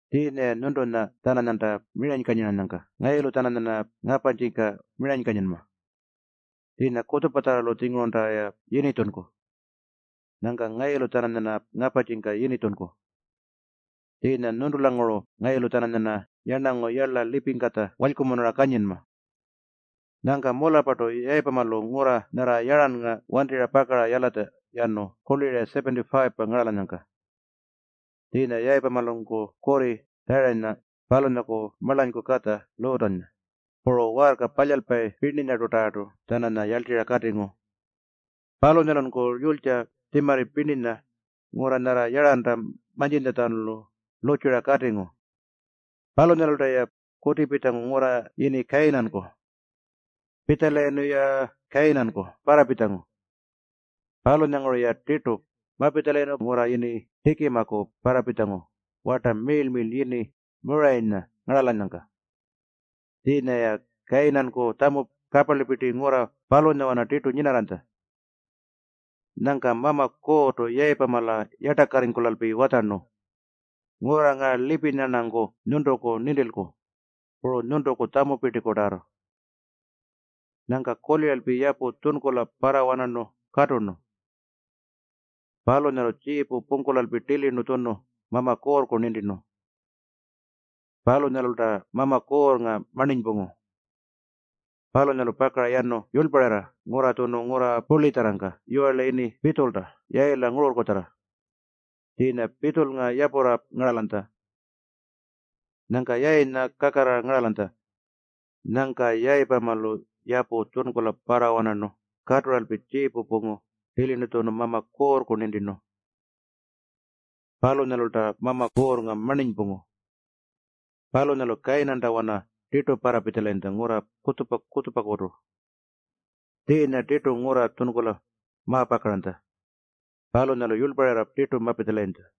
Tjiinya-ya nyuntunya-tjananyanta miranykanyiranyangka ngayulu-tjananyarna ngaparrtjika miranykanyinma. Tjiinya kutjupatjarralu-tjingurunta-ya yinitjunku. Nyangka ngayulu-tjananyarna ngaparrtjika yinitjunku. Tjiinya nyuntulanguru ngayulu-tjananyarna yarnangu yarla lipingkatja walykumunura kanyinma.” Nyangka mularrpartu Yayipamalu ngurra nyarra Yarrannga wantirra pakara yalatja yanu kurli-ra 75-pa ngaralanyangka. Tjiinya Yayipamalunku kurri Tjarayinya, palunyaku marlanyku katja Luutanya, puru waarka palyalpayi pirninyatarrartu-tjananya yarltirra katingu. Palunyalunku yulytja puru tjimarri pirninya ngurra nyarra Yarranta mantjintjalu lurrtjura katingu. Palunyalulta-ya kutipitjangu ngurra yini Kayinanku. Pitjalayirnu-ya Kayinanku parrapitjangu. Palunyanguru-ya tirtu mapitjalayirnu ngurra yini Tjikimaku parrapitjangu warta miirl-miirlpa yini Muurayinya ngaralanyangka. Tjiinya-ya Kayinanku tjamu kaparlipirti ngurra palunyawana tirtu nyinarranytja. Nyangka Mama Kuurrtu Yayipamala yartakarringkulalpi watjarnu, “Ngurra ngaa lipinya-rnanku nyuntuku nintilku, puru nyuntuku tjamupirtikutarrartu.” Nyangka kuliralpi yapu tjunkula parrawanarnu katurnu. Palunyalu tjiipu pungkulalpi tilirnu tjunu Mama Kuurrku nintirnu. Palunyalulta Mama Kuurrnga marninypungu. Palunyalu pakara yurlparirra yanu ngurra tjunu ngurra purlitjarrangka yiwarla yini Pitjulta Yayila ngururrkutjarra. Tjiinya Pitjulnga yapurra ngaralanytja. Nyangka Yayinya kakarrara ngaralanytja. Nyangka Yayipamalu yapu tjunkula parrawanarnu katuralpi tjiipu pungu tilirnu tjunu Mama Kuurrku nintirnu. Palunyalulta Mama Kuurrnga marninypungu. Palunyalu Kayinantawana tirtu parrapitjalayintja ngurra kutjupa-kutjupakutu. Tjiinya tirtu ngurra tjunkula mapakaranytja. Palunyalu yurlparirra tirtu mapitjalayintja.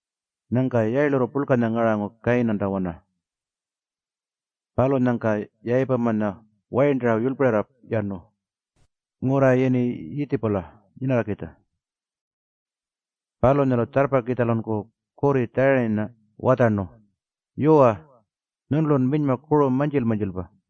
Nyangka yayilurru purlkanya ngarangu Kayinantawana. Palunyangka Yayipamanya wayirntara yurlparirra yanu ngurra yini Yiitjipula nyinakitja. Palunyalu tjarrpakitjalunku kurri Tjarayinya watjarnu, “Yuwa, nyuntulun minyma kuru mantjil-mantjilpa.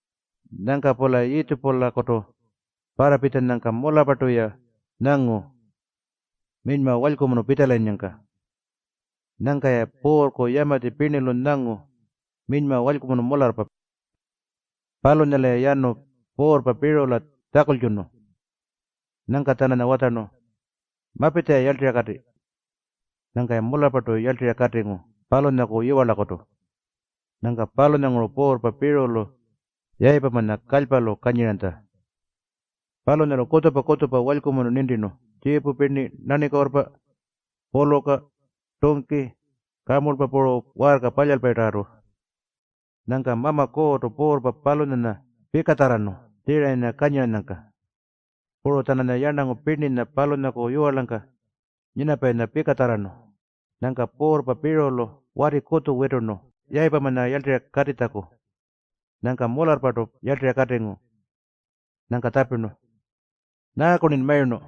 Nyangka-pula Yiitjipulakutu parrapitjanyangka mularrpartu-ya nyangu minyma walykumunu pitjalayinnyangka. Nyangka-ya puurrku yamatji pirnilu nyangu minyma walykumunu mularrpa. Palunyalu-ya yanu puurrpa Piirula tjakultjunu. Nyangka-tjananya watjarnu, “Mapitja-ya yarltirra kati.” Nyangka-ya mularrpartu yarltirra katingu palunyaku yiwarlakutu. Nyangka palunyanguru puurrpa Piirulu Yayipamanya kalypalu kanyiranytja. Palunyalu kutjupa-kutjupa walykumunu nintirnu, tjiipu pirni, nanikuurrpa, puluka, tungki, kamurlpa puru waarka palyalpayinyatarrartu. Nyangka Mama Kuurrtu puurrpa palunyanya pikatjarrarnu Tjarayinya kanyiranyangka. Puru-tjananya yarnangu pirninya palunyaku yiwarlangka nyinapayinya pikatjarrarnu. Nyangka puurrpa Piirulu wati kutju witurnu Yayipamanya yarltirra katitjaku. Nyangka mularrpartu yarltirra katingu. Nyangka tjapirnu, “Nyaaku-rnin mayurnu?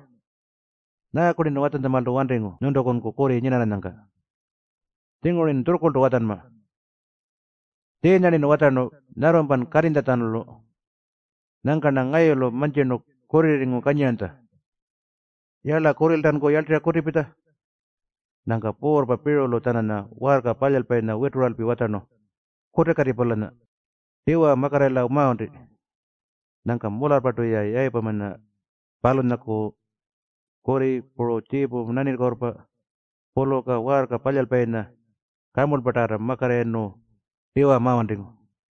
Nyaaku-rnin watjantjamaaltu wantingu nyuntukunku kurri nyinarranyangka? Tjinguru-rnin tjurrkurltu watjanma. Tjiinya-rnin watjarnu nyarrumpan katinytjalu. Nyangka-rna ngayulu mantjirnu kurrirringu kanyiranytja. Yala, kurriltanku yarltirra kutipitja!” Nyangka puurrpa Piirulu-tjananya waarka palyalpayinya wituralpi watjarnu, “Kutikati-pulanya. Tiwa makatirrayila wanti.” Nyangka mularrpartu-ya Yayipamanya, palunyaku kurri, puru tjiipu, nanikuurrpa, puluka, waarka palyalpayinya puru kamurlpatarrartu makatirrayirnu tiwa mawantingu.